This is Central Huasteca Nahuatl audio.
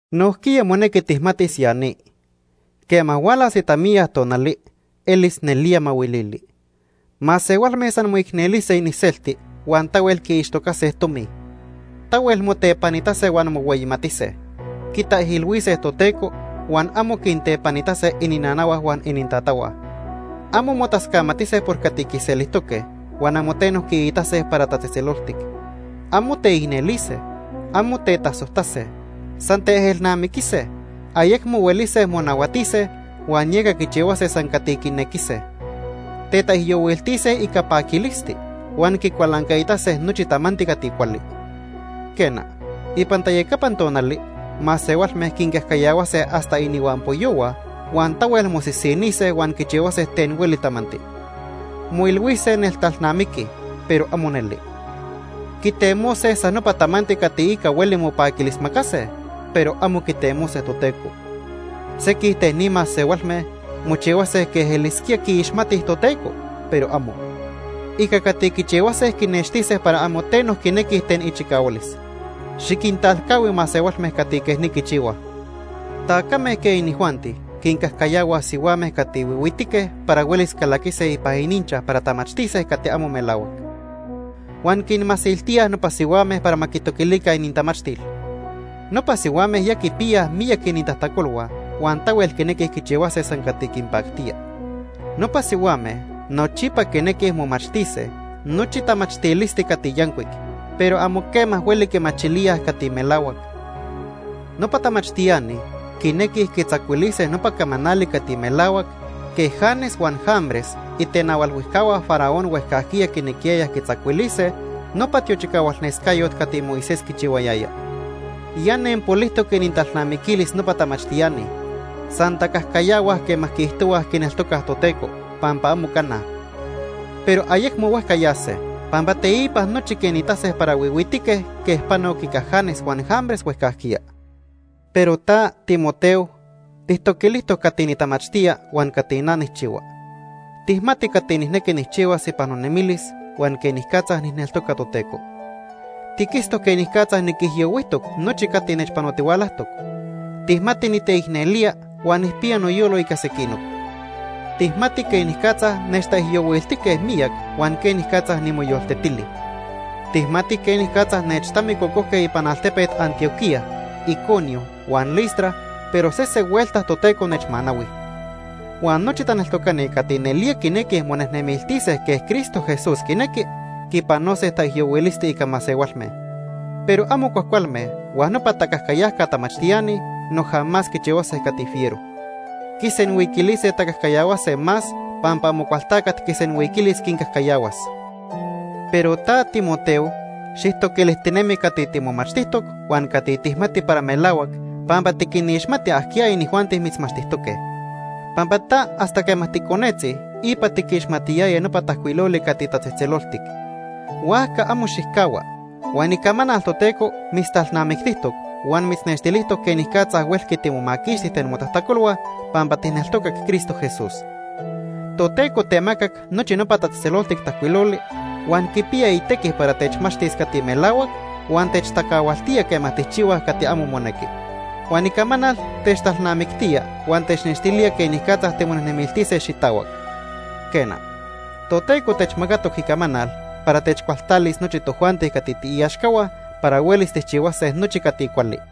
Nojquiya monequi tijmatis ya ni. Quema hualas itamiya tonali elis nelía mahuilili. Masehualme san moicnelise iniselti huan tahuel quiixtocase tomi. Tahuel motepanitase huan mohueyimatise. Quitaijilhuise Toteco huan amo quintepanitase ininanahua huan inintatahua. Amo motascamatise por cati quiselijtoque huan amo teno quiitase para tatzejtzeloltic. Amo teicnelise. Amo tetasojtase. San teejelnamiquise, ayecmo huelise monahuatise huan yeca quichihuase san cati quinequise. Tetaijyohuiltise ica paquilisti, huan quicualancaitase nochi tamanti cati cuali. Quena, ipan tayacapan tonali masehualme quincajcayahuase hasta inihuampoyohua huan tahuel mosisinise huan quichihuase ten hueli tamanti. Moilhuise neltalnamiquij, pero amo neli. Quitemose san nopa tamanti cati ica hueli mopaquilismacase, pero amo quitemose Toteco. Sequij ten ni masehualme mochihuase quej elisquía quiixmatij Toteco, pero amo. Ica cati quichihuase quinextise para amo teno quinequij ten ichicahualis. Xiquintalcahui masehualme cati quej ni quichihuaj. Tacame quej inijuanti quincajcayahuaj sihuame cati huihuitique para huelis calaquise ipan ininchaj para tamachtise cati amo melahuac. Huan quinmasiltíaj nopa sihuame para ma quitoquilica inintamachtil. Nopa sihuame ya quipiyaj miyac inintajtacolhua huan tahuel quinequij quichihuase san cati quinpactía. Nopa sihuame nochipa quinequij momachtise nochi tamachtilisti cati yancuic, pero amo quema hueli quimachilíaj cati melahuac. Nopa tamachtiani quinequij quitzacuilise nopa camanali cati melahuac quej Janes huan Jambres, itenahualhuijcahua Faraón huejcajquiya quinequiyayaj quitzacuilise nopa tiochicahualnescayot cati Moisés quichihuayaya. Ya nenpolijtoc inintalnamiquilis nopa tamachtiani. San tacajcayahuaj quema quiijtohuaj quineltocaj Toteco, pampa amo cana. Pero ayecmo huejca yase, pampa teipa nochi quinitase para huihuitique quej panoc ica Janes huan Jambres huejcajquiya. Pero ta, Timoteo, tijtoquilijtoc cati nitamachtía huan cati na nijchihua. Tijmati cati nijnequi nijchihuas ipan nonemilis huan quenicatza nijneltoca Toteco. Tiquitztoc quenicatza niquijyohuijtoc nochi cati nechpanotihualajtoc. Tijmati niteicnelía huan nijpiya noyolo ica sequinoc. Tijmati quenicatza nechtaijyohuiltijque miyac huan quenicatza nimoyoltetili. Tijmati quenicatza nechtamicocojque ipan altepet Antioquía, Iconio huan Listra, pero sese huelta Toteco nechmanahui. Huan nochi taneltocani cati nelía quinequij monejnemiltise quej Cristo Jesús quinequi, quipanose taijyohuilisti ica masehualme. Pero amo cuajcualme huan nopa tacajcayajca tamachtiani noja más quichihuase cati fiero. Quisenhuiquilise tacajcayahuase más pampa Amocualtacat quisenhuiquilis quincajcayahuas. Pero ta, Timoteo, xijtoquilijtinemi cati timomachtijtoc huan cati tijmati para melahuac pampa tiquinixmati ajquiya inijuanti mitzmachtijtoque. Pampa ta hasta quema ticonetzi ipa tiquixmatiyaya nopa Tajcuiloli cati tatzejtzeloltic. Huajca amo xijcahua. Huan Icamanal Toteco mitztalnamictijtoc huan mitznextilijtoc quenicatza huelqui timomaquixti ten motajtacolhua pampa tijneltocac Cristo Jesús. Toteco temacac nochi nopa Tatzejtzeloltic Tajcuiloli, huan quipiya itequi para techmachtis cati melahuac huan techtacahualtía quema tijchihuaj cati amo monequi. Huan Icamanal techtalnamictía huan technextilía quenicatza timonejnemiltise xitahuac. Quena, Toteco techmacatoc Icamanal para techcualtalis nochi tojuanti cati tiiaxcahua para huelis tijchihuase nochi cati cuali.